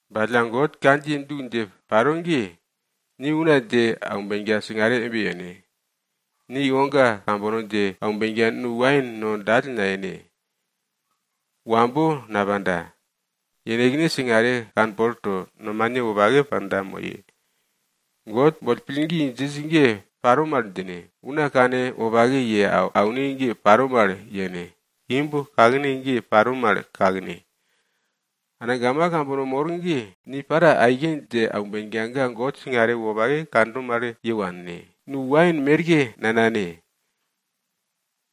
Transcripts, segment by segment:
Ba alla God kandjiye du dje paro ge, ni una dje aumbenka singare embe yene. Ni iwoga kambono dje aumbenka nu wain no dall nayene. Wambo napanda, yenekne singare kanpol to, nomane wopake panda moye. God boll pillgi djinj ge paro mal djine, una kanwopake ye aune ge paro mal yene, imb kakne ge paro mal kakne. Angama kambono mor ge, ni para aike dje aumbenka ga God singare wopake kando mal ye wanne. Nu wain merke nanane.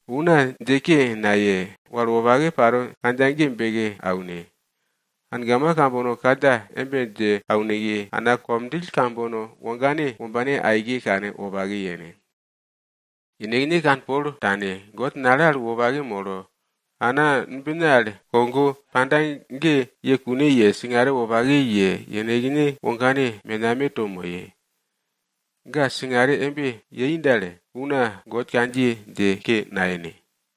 Una dje ke naye, wal wopake paro kandja ge beke aune. Angama kambono kandja embe dje beke auneke, ana komdjill kambono wogane wombane aike kanwopake yene. Yenekne kanpol tane, God nale al wopake molo, ana numbine al kogo panda ge ye kune ye, singare wopake ye, yenekne wogane menameto moye. Ga singare embe yei dal, una God kandjiye dje ke nayene.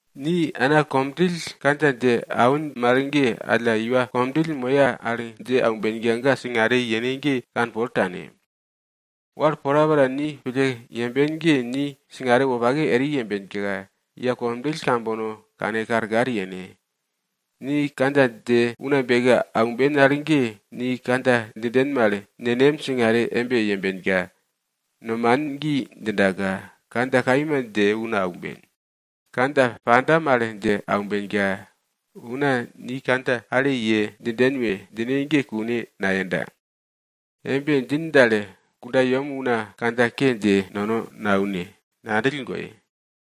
Ni ana komdjill kandja dje awin mal ge, alla iwa komdjill moye al dje aumbenka ga singare yene ge kanpol tane. Wal porapora ni pille yemben ge, ni singare wopake eri yembenka, iwa komdjill kambono kane karkar yene. Ni kandja dje una beke aumben al ge, ni kandja djinden mal nenem singare embe yembenka, nomanin gi djindaka, kandja kaima dje una aumben. Kandja panda mal dje aumbenka, una ni kandja ale ye djinden we djine ge kune nayenda. Embe djin dal, kundayem una kandja ke dje nono naune, ngandjill goye.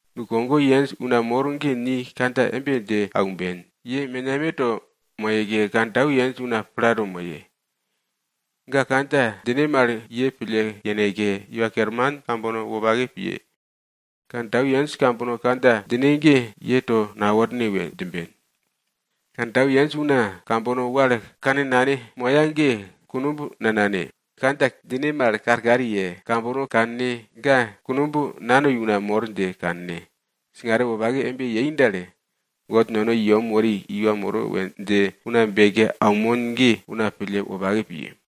Nukogo yenj una mor ge ni kandja embe dje aumben, ye menameto moyeke, kantau yenj una plato moye. Ga kandja djine mal ye pille yeneke, iwa kerman kambono wopake piye. Kantau yenj kambono kandja djine ge ye to naworne we djimben. Kantau yenj una kambono wal kannane moya ge kunumb nanane. Kandja djine mal karkar ye, kambono kanne, ga kunumb nanoi una mor dje kanne. Singare wopake embe yei dal, God nono i yem wori iwa moro we dje una beke aunmon ge, una pille wopake piye.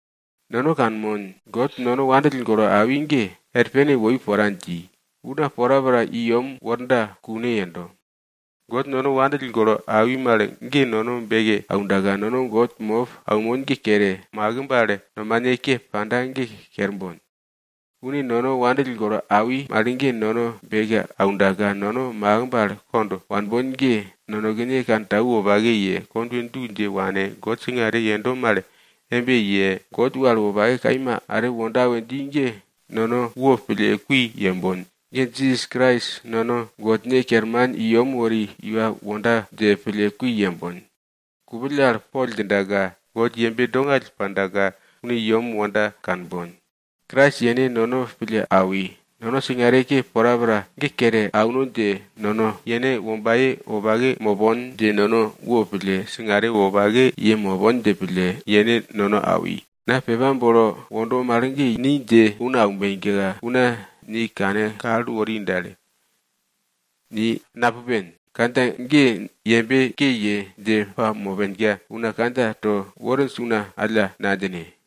Nono kanmon, God nono wopake pille awi ge, er pene woi pora dji, una porapora i yem worda kune yendo. God nono wopake pille awi mal ge nono beke aundaka, nono God mop aunmon ge kere, makimb al nomane ke panda ge kerbon. Une nono wandill golo awi mal ge nono beke aundaka, nono makimb al kond wanbon ge, nonekene kantau wopake ye, kondwe du dje wane, God singare yendo mal embe ye, God wal wopake kaima are wonda we dji ge, nono wopille kui yembon. Jisas Krais nono Godne kerman i yem wori iwa wonda dje pille kui yembon. Kupill al poll dje au kerman djindaka, God yembe dongall pandaka une yem wonda kanbon. Krais yene nono pille awi. Nono singare ke porapora ge kere auno dje, nono yene wombaye wopake mopon dje, nono wopille singare wopake ye mopon dje pille yene nono awi. Na pepa bolo wondo mal ge, ni dje una aumbenka, una ni kane kal wori dal, ni napupen, kandja ge yembe ke ye dje pamopenka una kandja to worinj una alla nadjine.